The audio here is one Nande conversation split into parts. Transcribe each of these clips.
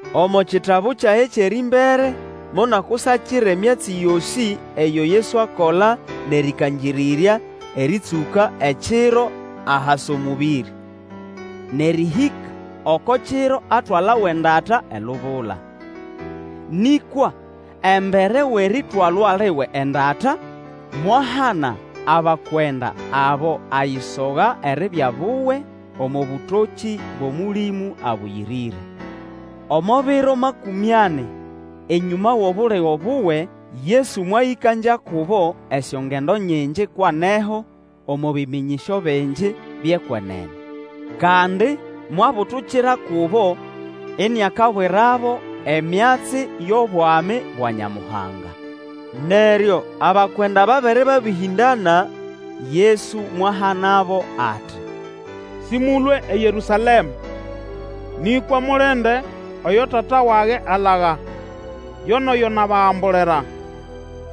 Omo kitabu kyage kyʼerĩmbere monakusakira emyatsi yosĩ eyo Yesu akola nʼerĩkangĩrĩrya, erĩtsũka ekiro ahasa omũbĩrĩ, nʼerĩhĩka oko kiro atwalawa endata elubula. Nĩkwa embere wʼeritwalwa liwe endata, mwahana abakwenda abo ayisoga eribya buwe, omo bũtokĩ bwʼOmũlĩmũ Abũyĩrĩre. Omo biro makũmĩ ani enyũma wʼobuligo buwe, Yesu mwayĩkangya kubo esyongendo nyingi kwʼaneho, omo bĩmĩnyĩsyo bingi byʼekwenene. Kandi mwabutukira kubo, iniakabwirabo emyatsi yʼobwami bwa Nyamuhanga. Neryo abakwenda babere babĩhĩndana, Yesu mwahanabo ati, Sĩmũlũe eYerũsalema, nĩkwa mulinde oyo Tata wage alaga, yo nʼoyo nabagambulira.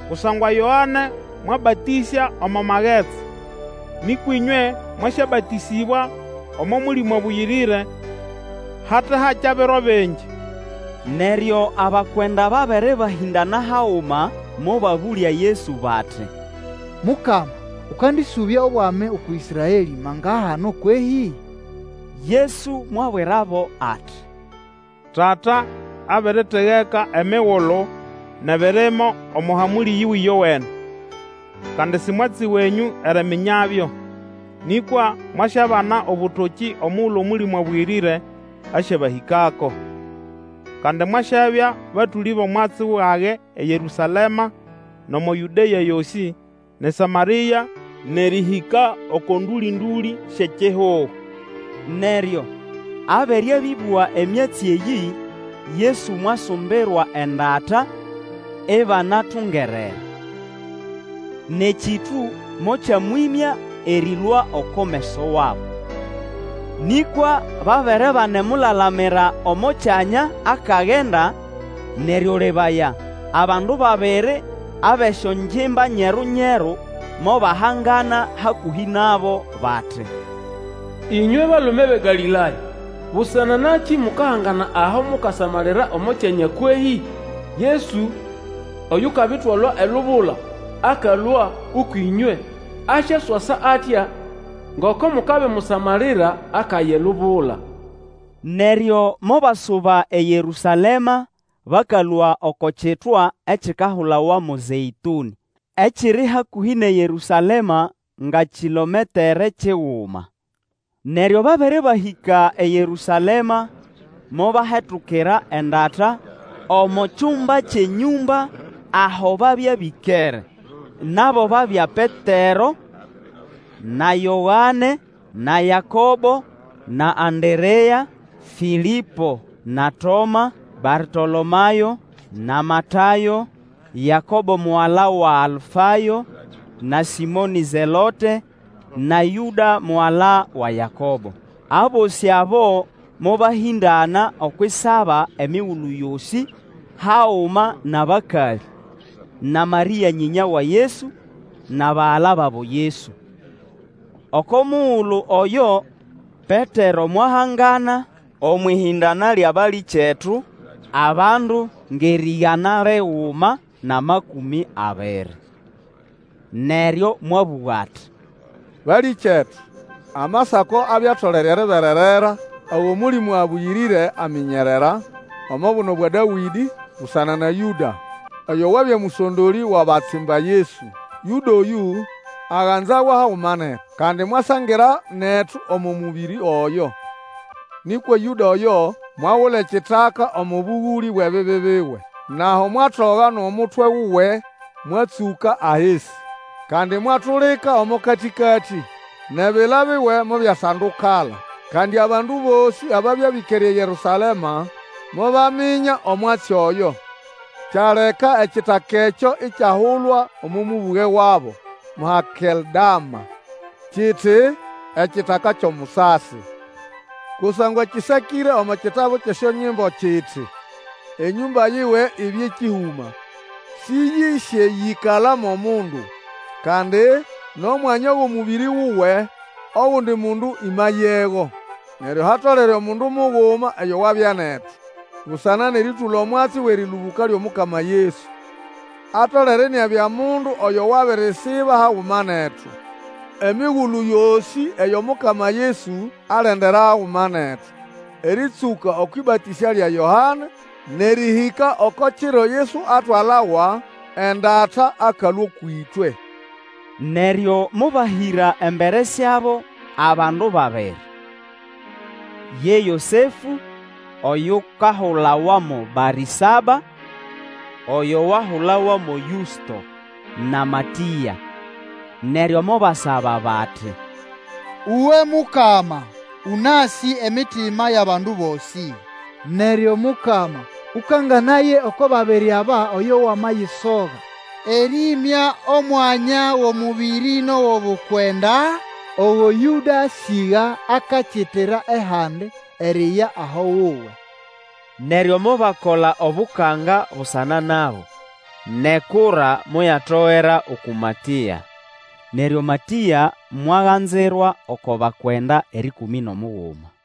Kusangwa Yoane mwabatĩsya omo magetsi, nĩkwa ĩnywe mwasyabatĩsĩbwa omo Mũlĩmũ Abũyĩrĩre hate hakya biro bingi. Neryo abakwenda babere bahĩndana haguma, mobabũlya Yesu bati, Mukama, ũkandĩsũbya obwami uku Ĩsraelĩ mangahano kwehĩ? Yesu mwabwirabo ati, Tata abiritegeka emigulu nʼebirimo omo hamũlĩ yiwe ĩyowene. Kandi si mwatsi wenyũ eriminyabyo. Nĩkwa mwasyabana obũtokĩ omugulu Omũlĩmũ Abũyĩrĩre asyabahĩkako. Kandi mwasyabya batũlĩ bʼomwatsi wage eYerũsalema nʼomo Yũdea yosĩ, nʼeSamarĩa, nʼerĩhĩka oko ndũlĩ-ndũlĩ syʼekihugo. Neryo abere abĩbũga emyatsi eyĩ, Yesu mwasumbirwa endata ibanatungerere, nʼekĩtũ mokyamwĩmya erĩlũa oko meso wabo. Nĩkwa babere banemulalamira omo kyanya akagenda, neryo lebaya, abandu babiri abʼesyongimba nyeru-nyeru, mobahangana hakũhĩ nabo, bati, Ĩnywe balume bʼeGalĩlaya, busana nakĩ mukahangana aho mukasamalira omo kyanya kwehĩ? Yesu oyukabitwalwa elubula akalũa ũkwʼĩnywe, asyaswasa atya ngoko mukabimusamalira akaya elubula. Neryo mobasuba eYerũsalema bakalũa oko kitwa ekikahulawa mo Zeĩtũnĩ, ekiri hakũhĩ nʼeYerũsalema ngʼekilometre kiguma. Neryo babere bahĩka eYerũsalema, mobahetukira endata omo kyumba kyʼenyũmba aho babya bĩkere. Nabo babya Petero, na Yoane, na Yakobo, na Anderea, Fĩlĩpo na Toma, Bartolomayo, na Matayo, Yakobo mugala wa Alfayo, na Sĩmonĩ-Zelote, na Yũda mugala wa Yakobo. Abosĩ abo mobahĩndana okwʼisaba emigulu yosĩ, haguma nʼabakalĩ, na Marĩa nyĩnya wa Yesu, nʼabagala babo Yesu. Oko mugulu oyo, Petero mwahangana omwʼĩhĩndana lyʼabalĩkyetu, abandu ngʼerĩgana liguma nʼamakũmĩ abiri. Neryo mwabũga ati, Balĩkyetu, Amasako abya atolere eribererera ago Mũlĩmũ Abũyĩrĩre aminyerera omo buno bwa Dawĩdĩ busana na Yũda, oyo wabya mũsondolĩ wʼabatsimba Yesu. Yũda oyũ aganzawa haguma netu, kandi mwasangira netu omo mũbĩrĩ oyo. (Nĩkwa Yũda oyo, mwagula ekitaka omo bũgũlĩ bwʼebibi biwe; nʼaho mwatoga nʼomutwe wuwe mwatsũka ahisi, kandi mwatulika omo katĩkatĩ nʼebila biwe mobyasandukala. Kandi abandu bosĩ ababya bĩkere eYerũsalema mobaminya omwatsi oyo; kyaleka ekitaka ekyo ikyahulwa omo mũbũge wabo mo Hakeldama, kiti, Ekitaka kyʼomusasi.) Kusangwa kĩsakĩre omo kitabu kyʼesyonyimbo kiti, Enyũmba yiwe ibye kĩhũma, Sĩyĩsyesyĩkala mo mundu; kandi, Nʼomwanya wʼomũbĩrĩ wuwe, ogundi mundu ĩmayego. Neryo hatolere omundu muguma oyo wabya netu, busana nʼerĩtũla omwatsi wʼerĩlũbũka lyʼomukama Yesu. Atolere iniabya mundu oyo wabirisiba haguma netu emigulu yosĩ eyo Mukama Yesu alendera haguma netu, erĩtsũka okwʼĩbatĩsya lya Yoane nʼerĩhĩka oko kiro Yesu atwalawa endata akalũa ũkwʼĩtwe. Neryo mobahĩra embere syabo abandu babiri, ye Yosefũ oyukahulawa mo Barĩsaba, oyo wahulawa mo Yũsto, na Matĩa. Neryo mobasaba bati, Uwe, Mukama, ũnasĩ emitima yʼabandu bosĩ. Neryo Mukama, Ũkanganaye oko babiri aba, oyo wamayisoga, erĩĩmya omwanya wʼomũbĩrĩ nʼowʼobukwenda ogo Yũda asĩga akakitira ehandi eriya aho wuwe. Neryo mobakola obukanga busana nabo, nʼekura moyatogera uku Matĩa; neryo Matĩa mwaganzirwa oko bakwenda erĩkũmĩ nʼomuguma.